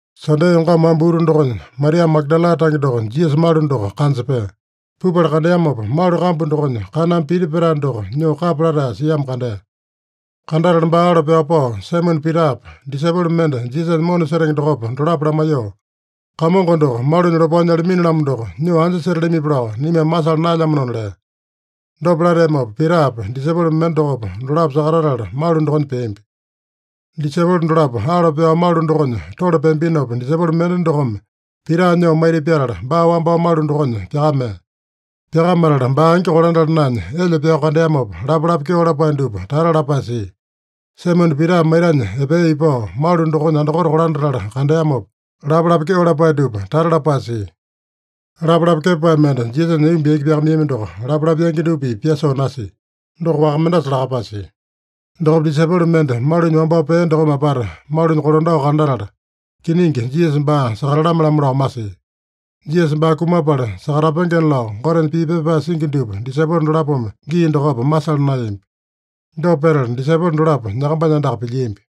Sande yongama wamba utu dokonya, Maria Magadala tange doko Jisasa malu doko kanja pea. Pupala kandeamopa, malu kambu dokonya kaname piti petae doko nyoo kapya latae siamo kandea. Kandatala baa alo pyao pao Saimone Pitapa, disaipolo mende Jisasanya mona setenge dokopa, dolapo lamaiyoo, “Kamongo doko malunya lopao nyalamini-lamo doko, nyoo anja setalamipi lao naimame masala naelyamanona” lea. Dopa lateamopa Pitapa, disaipolo mende dokopa, dolapo sakatatala malu dokonya peambi. Disaipolo dolapo alo pyao malu dokonya tole peambinopa, disaipolo mende dokome Pita nyoo maita pyatala, baa wambao malu dokonya pyakamea. Pyakamatala baa angi kolandala naenya elyo pyao kandeamopa, lapalapa kyeo lapae dupa tata lapae sia. Saimone Pita maitanya epea ipao malu dokonya andakote kolandatala kandeamopa, lapalapa kyeo lapae dupa tata lapae sia. Lapalapa kepapae mende Jisasanya aiyomba yaki pyakamaiyami doko lapalapa yangi dupa-pipa pyasoo nasia. Doko waka mendasa lakapae sia. Dokopa disaipolo mende malunya wambao pea dokome apata malunya kolandao kandatala, kiningi Jisasa baa sakatalame-lamo lao masia. (Jisasa baa kumapala sakatapengena lao Gotenya pii pepa pyapae singi dupa disaipolo dolapome gii dokopa masala naeyambi.) Dopa petala disaipolo dolapo nyakambanya andaka pilyiambi.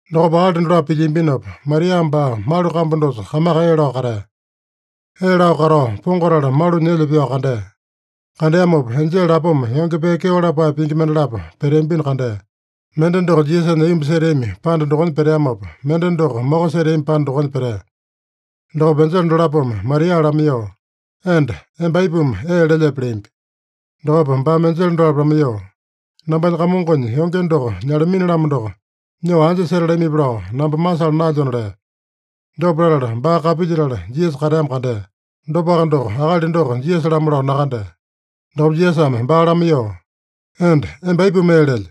Dokopa akali dolapo pilyiambinopa, Maria baa malu kambu dosa kamaka ee lao katea. Ee lao katao pongatala malunya elyo pyao kandea. Kandeamopa, enjele lapoma yonge pee kyeo lapae pingi mendalapo peteambino kandea. Mende doko Jisasanya aiyomba seteami panda dokonya peteamopa, mende doko moko seteami panda dokonya petea. Dokopa enjele dolapome Maria lamaiyoo, “Enda, emba aipuma ee lelyepe?” leambi. Dokopa baame enjele dolapo lamaiyoo, “Nambanya Kamongonya yonge doko nyalamini-lamo doko, nyoo anja setalamipi lao namba masala naelyona” lea. Dopa latala, baa kapilyetala Jisasa kateamo kandea. Dopaka doko, akali doko Jisasa-lamo lao nakandea. Dokopa Jisasame baa lamaiyoo, “Enda, emba aipuma ee lelye?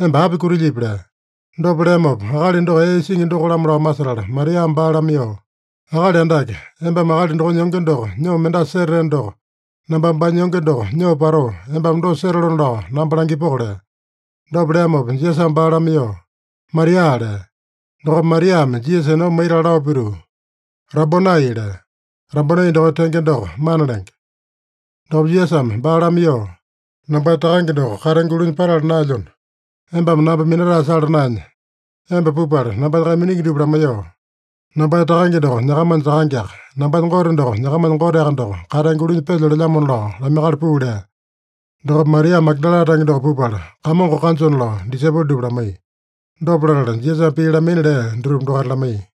Emba api kutilyipi?” lea. Dopa leamopa, akali doko ee isingi doko-lamo lao masetala Mariame baa lamaiyoo, “Akali Andake, embame akali dokonya yonge doko nyoo mendasa setateno doko, nambame baanya yonge doko nyoo patoo, embame dosa setalona lao namba langipoko” lea. Dopa leamopa Jisasame baa lamaiyoo, “Maria!” lea. Dokopa Mariame Jisasa enomba maitala lao pituu, “Rabonai!” lea. (Rabonai dokonya tenge doko, Mana lenge.) Dokopa Jisasame baa lamaiyoo, “Nambanya Takange doko katenge ulunya patala naelyona, embame namba minatae sala naenya, emba pupala nambanya kaiminingi dupa lamaiyoo, ‘Nambanya Takange doko, nyakamanya Takangeaka, nambanya Gote doko, nyakamanya Goteaka doko katenge ulunya pelyo’ lelyamona lao lamaiyakala puu” lea. Dokopa Maria Magadala tange doko pupala, Kamongo kanjona lao disaipolo dupa lamaiya. Dopa latala, Jisasame pii lamaina lea dutupa dokaita lamaiya.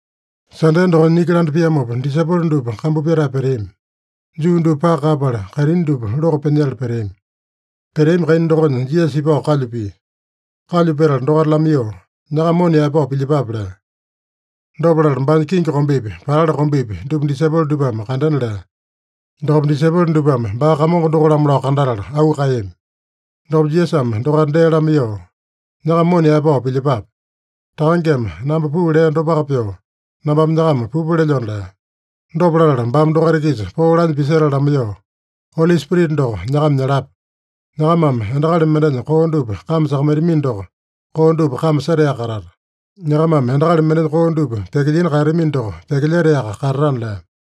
Sande dokonya niki landa piamopa disaipolo dupa kambu pyatae peteami. Juu dupa paka kaeyapala, kaitini dupa loko pyanyetala peteami. Peteami kaina dokonya Jisasa ipao kalyu pia. Kalyu petala dokaita lamaiyoo, “Nyakama mona yaepao pilyepape” lea. Dopa latala baanya kingi kombepi, patali kombepi, dupa disaipolo dupame kandena lea. Dokopa disaipolo dupame baa Kamongo doko-lamo lao kandatala auu kaeyami. Dokopa Jisasame dokaita dee lamaiyoo, “Nyakama mona yaepao pilyepape. Takangeme namba puu lea dopaka pyoo, nambame nyakama pupa lelyona” lea. Dopa latala baame dokaita-kisa poo lanya pisetala lamaiyoo, “Oli Spirita doko nyakama nyalapa. Nyakamame endakali mendenya koo dupa kame sakamaitamino doko, koo dupa kame setaeyaka katata. Nyakamame endakali mendenya koo dupa pyakilyina kaeyatamino doko, pyakilyetaeyaka katatana” lea.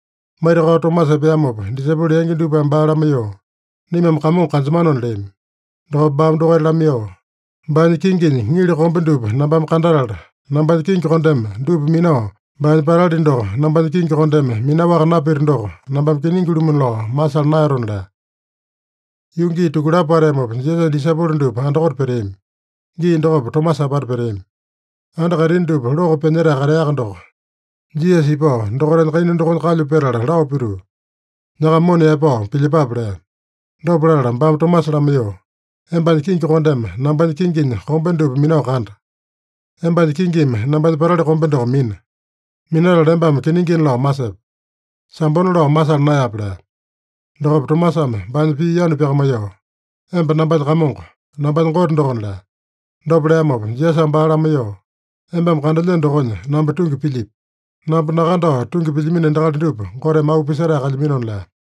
Maitakao Tomasa epeamopa disaipolo yangi dupame baa lamaiyoo, “Naimame Kamongo kanjemanona” leami. Dokopa baame dokaita lamaiyoo, “Baanya kinginya ŋili kombe dupa nambame kandatala, nambanya kingi kondeme dupa minao, baanya patali doko nambanya kingi kondeme minaowaka napito doko, nambame kiningi-lumu lao masala naeyatona” lea. Yuu gii tukulapo pateamopa, Jisasanya disaipolo dupa andakote peteami. Gii dokopa Tomasa apata peteami. Anda kaitini dupa loko pyanyetae kateaka doko, Jisasa ipao dokaitanya kaina dokonya kalyu petala lao pituu, “Nyakama mona yaepao pilyepape” lea. Dopa latala baame Tomasa lamaiyoo, “Embanya kingi kondeme nambanya kinginya kombe dupa minao kanda. Embanya kingimi nambanya patali kombe doko mina. Minatala embame kiningina lao masepe. Sambona lao masala naeyape” lea. Dokopa Tomasame baanya pii yanu pyakamaiyoo, “Emba nambanya Kamongo, nambanya Gote dokona” lea. Dopa leamopa Jisasame baa lamaiyoo, “Embame kandelyeno dokonya namba tungi pilyipi? Namba nakandao tungi pilyamino endakali dupa Goteme auu pisetae kalyaminona” lea.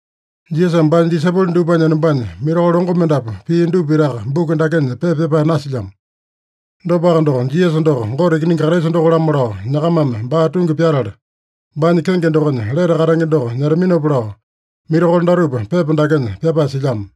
Jisasame baanya disaipolo dupanya enombanya mirakolo longo mendapu pia dupa pitaka buku dakenya pepa pyapae nasilyamo. Dopaka doko, Jisasa doko Gote Ikiningi Kraisa doko-lamo lao nyakamame baa tungi pyatala, baanya kenge dokonya lete katenge doko nyetaminopa lao, mirakolo datupa pepa dakenya pyapae silyamo.